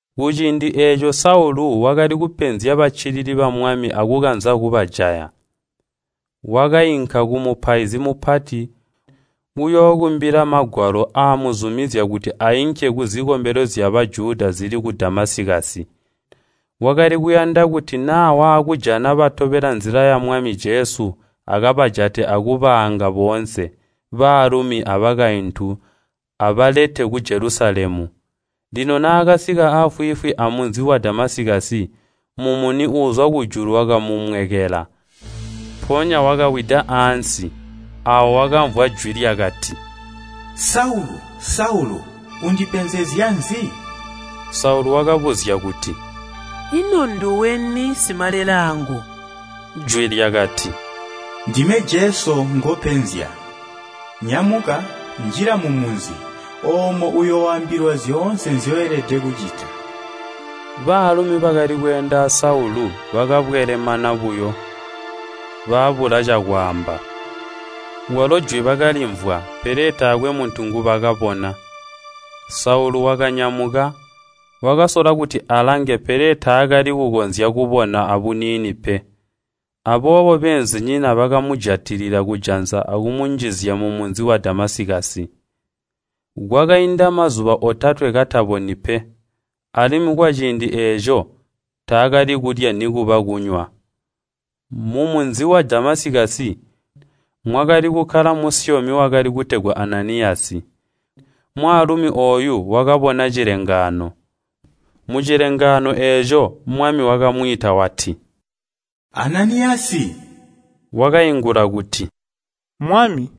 Kuciindi eeco Saulu wakali kupezya baccilili ba Mwami akukanza kubajaya. Wakainka kumupaizi mupati kuyookumbila magwalo aamuzumizya kuti ainke kuzikombelo zya Bajuda zili ku Damasikasi. Wakali kuyanda kuti naa waakujana batobela Nzila ya Mwami Jesu akabajate akubaanga boonse, baalumi abakaintu, abalete ku Jelusalemu. Lino naakasika aafwiifwi amunzi wa Damasikasi, mumuni uuzwa kujulu wakamumwekela. Mpoonya wakawida ansi, aawo wakamvwa jwi lyakati, “Saulu, Saulu! Undipenzezya nzi?” Saulu wakabuzya kuti, “Ino nduweni Simalelaangu?” Jwi lyakati, “Ndime Jesu ngopenzya. Nyamuka, njila mumunzi, oomo uyooambilwa zyoonse nzyoelede kucita.” Baalumi bakali kweenda aa Saulu, bakabwelemana buyo, babula acakwaamba. Kwalo jwi bakalimvwa, pele taakwe muntu ngubakabona. Saulu wakanyamuka, wakasola kuti alange pele taakali kukonzya kubona abuniini pe. Aboobo beenzinyina bakamujatilila kujanza akumunjizya mumunzi wa Damasikasi. Kwakainda mazuba otatwe kataboni pe, alimwi kwaciindi eeco taakali kulya nikuba kunywa. Mumunzi wa Damasikasi, mwakali kukkala musyomi wakali kutegwa Ananiyasi. Mwaalumi ooyu wakabona cilengaano. Mucilengaano eeco Mwami wakamwiita wati, “Ananiyasi!” Wakaingula kuti, “Mwami.”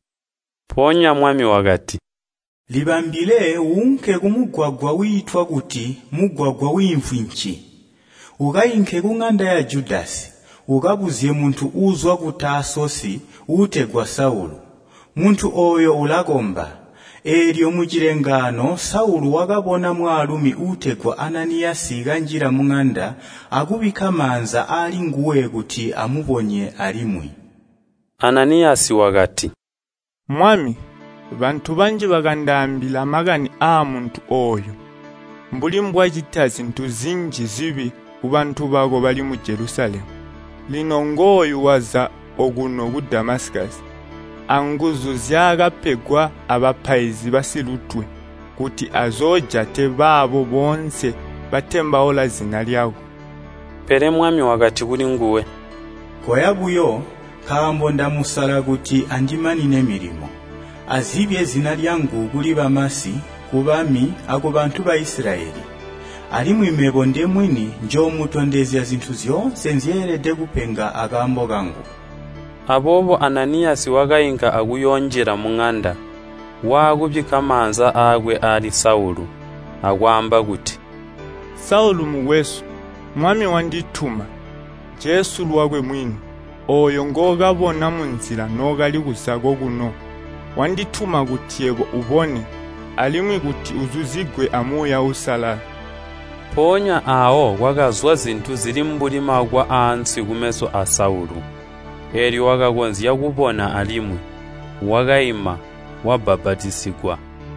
Mpoonya Mwami wakati, “Libambile uunke kumugwagwa wiitwa kuti, ‘Mugwagwa wiimvwi nci.’ Ukainke kuŋanda ya Judasi, ukabuzye muntu uuzwa ku Taasosi uutegwa Saulu. Muntu ooyo ulakomba. Eelyo mucilengaano Saulu wakabona mwaalumi uutegwa Ananiyasi kanjila muŋanda akubikka maanza aalinguwe kuti amubonye alimwi.” Ananiyasi wakati, “Mwami, bantu banji bakandaambila makani aamuntu ooyu, mbuli mbwacita zintu zinji zibi kubantu bako bali mu Jelusalemu. Lino ngooyu waza okuno ku Damasikasi anguzu nzyaakapegwa abapaizi basilutwe kuti azoojate baabo boonse batembaula zina lyako.” Pele Mwami wakati kulinguwe, “Koya buyo, nkaambo ndamusala kuti andimanine milimo, azibye zina lyangu kuli bamasi, kubami, akubantu Baisilayeli. Alimwi mebo ndemwini njoomutondezya zintu zyoonse nzyeelede kupenga akaambo kangu.” Aboobo Ananiyasi wakainka akuyoonjila muŋanda, waakubikka maanza aakwe aali Saulu, akwaamba kuti, “Saulu mukwesu, Mwami wandituma, Jesu lwakwe mwini, ooyo ngookabona munzila nookali kuza kokuno. Wandituma kuti yebo ubone, alimwi kuti uzuzigwe a Muuya Uusalala.” Mpoonya aawo kwakazwa zintu zili mbuli makwa aanswi kumeso aa Saulu, eelyo wakakonzya kubona alimwi. Wakaima, wabbapatizigwa.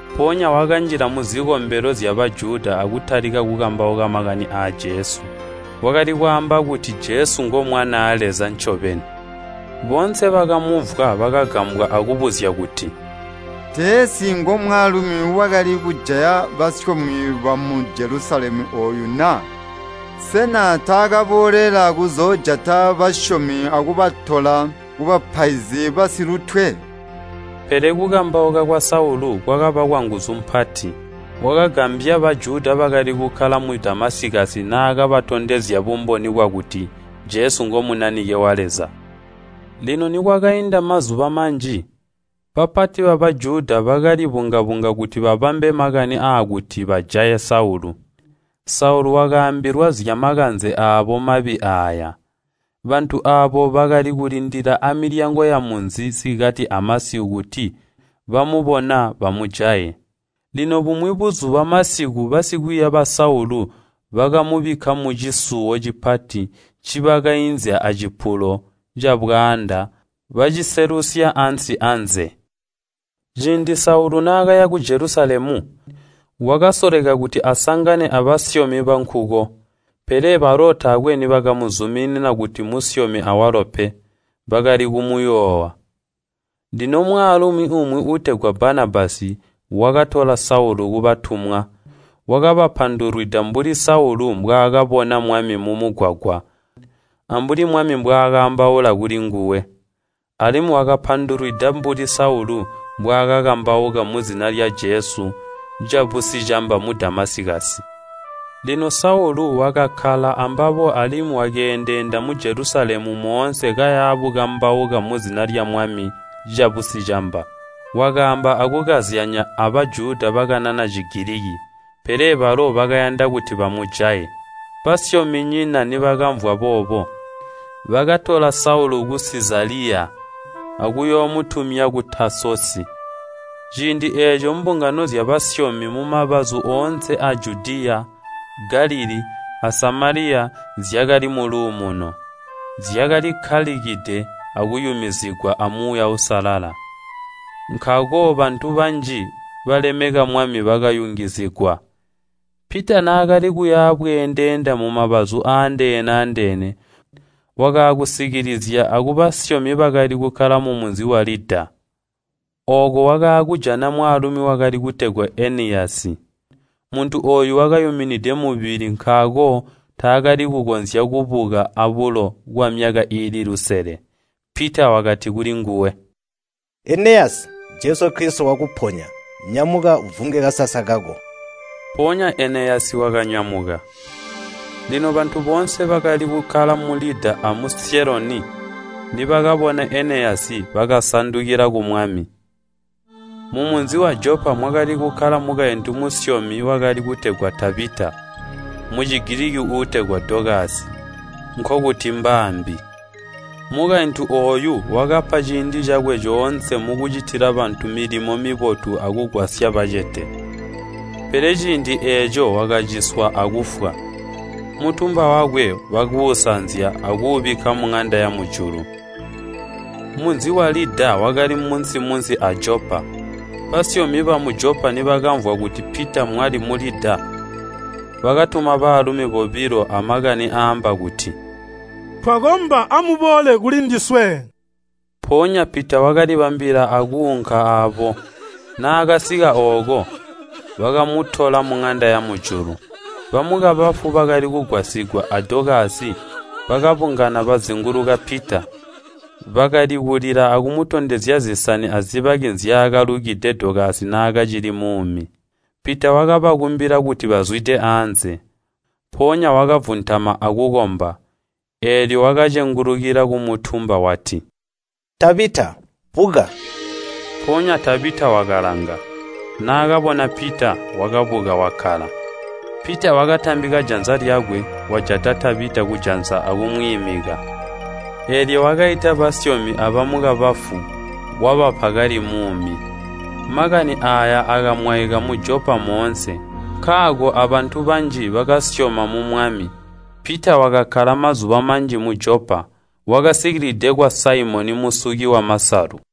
Mpoonya wakanjila muzikombelo zya Bajuda akutalika kukambauka makani aa Jesu. Wakali kwaamba kuti, “Jesu ngo Mwanaa Leza ncobeni.” Boonse bakamumvwa bakagambwa akubuzya kuti, “Teensi ngomwaalumi wakali kujaya basyomi bamu Jelusalemu ooyu na? Sena taakaboolela kuzoojata basyomi akubatola kubapaizi basilutwe?” Pele kukambauka kwa Saulu kwakaba kwanguzu mpati, wakagambya Bajuda bakali kukkala mu Damasikasi naakabatondezya bumboni bwakuti, “Jesu ngo Munanike wa Leza.” Lino nikwakainda mazuba manji, bapati ba Bajuda bakali bunga-bunga kuti babambe makani aakuti bajaye Saulu. Saulu wakaambilwa zyamakanze aabo mabi aaya. Bantu aabo bakali kulindilila amilyango yamunzi sikati amasiku kuti bamubona bamujaye. Lino bumwi buzuba masiku basikwiiya ba Saulu bakamubikka mucisuwo cipati ncibakainzya acipulo cabwaanda baciselusya ansi anze. Ciindi Saulu naakaya ku Jelusalemu, wakasoleka kuti asangane abasyomi bankuko, pele balo taakwe nibakamuzumina kuti musyomi awalo pe. Bakali kumuyoowa. Lino mwaalumi umwi uutegwa Banabasi wakatola Saulu kubatumwa. Wakabapandulwida mbuli Saulu mbwaakabona Mwami mumugwagwa, ambuli Mwami mbwaakaambaula kulinguwe. Alimwi wakabapandulwida mbuli Saulu mbwaakakambauka muzina lya Jesu cabusicamba mu Damasikasi. Lino Saulu wakakkala ambabo alimwi wakeendeenda mu Jelusalemu moonse kaya bukambauka muzina lya Mwami cabusicamba. Wakaamba akukazyanya a Bajuda bakanana Cigiliki, pele balo bakayanda kuti bamujaye. Basyominyina nibakamvwa boobo, bakatola Saulu ku Sizaliya akuyoomutumya ku Taasosi. Ciindi eeco mbungano zyabasyomi mumabazu oonse aa Judiya, Galilii, a Samaliya, zyakali muluumuno. Zyakalikkalikide akuyumizigwa a Muuya Uusalala, nkaako bantu banji balemeka Mwami bakayungizigwa. Pita naakali kuya bweendeenda mumabazu aandeene-andeene, wakaakusikilizya akubasyomi bakali kukkala mumunzi wa Lida. Ooko wakaakujana mwaalumi wakali kutegwa Eneyasi. Muntu ooyu wakayuminide mubili nkaako taakali kukonzya kubuka abulo kwamyaka iili lusele. Pita wakati kulinguwe, “Eneyasi, Jesu Kilisito wakuponya. Nyamuka uvunge kasasa kako.” Mpoonya Eneyasi wakanyamuka. Lino bantu boonse, bakalikukkala mu Lida amu Syeloni, nibakabona Eneyasi bakasandukila ku Mwami. Mumunzi wa Jopa mwakali kukkala mukaintu musyomi wakali kutegwa Tabita. (Mu Cigiliki utegwa Dokasi, nkokuti mbaambi.) Mukaintu ooyu wakapa ciindi cakwe coonse mukucitila bantu milimo mibotu akugwasya bacete. Pele ciindi eeco wakaciswa akufwa. Mutumba wakwe bakuusanzya akuubikka muŋanda yamujulu. Munzi wa Lida wakali munsi-munsi a Jopa. Basyomi bamu Jopa nibakamvwa kuti Pita mwali mu Lida, bakatuma baalumi bobilo amakani aamba kuti, “Twakomba amuboole kulindiswe.” Mpoonya Pita wakalibambila akuunka aabo. Naakasika ooko, bakamutola muŋanda yamujulu. Bamukabafu bakali kugwasigwa a Dokasi, bakabungana bazinguluka Pita. Bakali kulila akumutondezya zisani azibaki zyaakalukide Dokasi naakacili muumi. Pita wakabakumbila kuti bazwide anze, mpoonya wakavuntama akukomba. Eelyo wakacengulukila kumutumba wati, “Tabita, buka!” Mpoonya Tabita wakalanga, naakabona Pita, wakabuka wakkala. Pita wakatambika janza lyakwe, wajata Tabita kujanza akumwiimika. Eelyo wakaita basyomi abamukabafu, wabapa kali muumi. Makani aaya akamwaika mu Jopa moonse, nkaako abantu banji bakasyoma mu Mwami. Pita wakakkala mazuba manji mu Jopa, wakasikilide kwa Saimoni musuki wamasalu.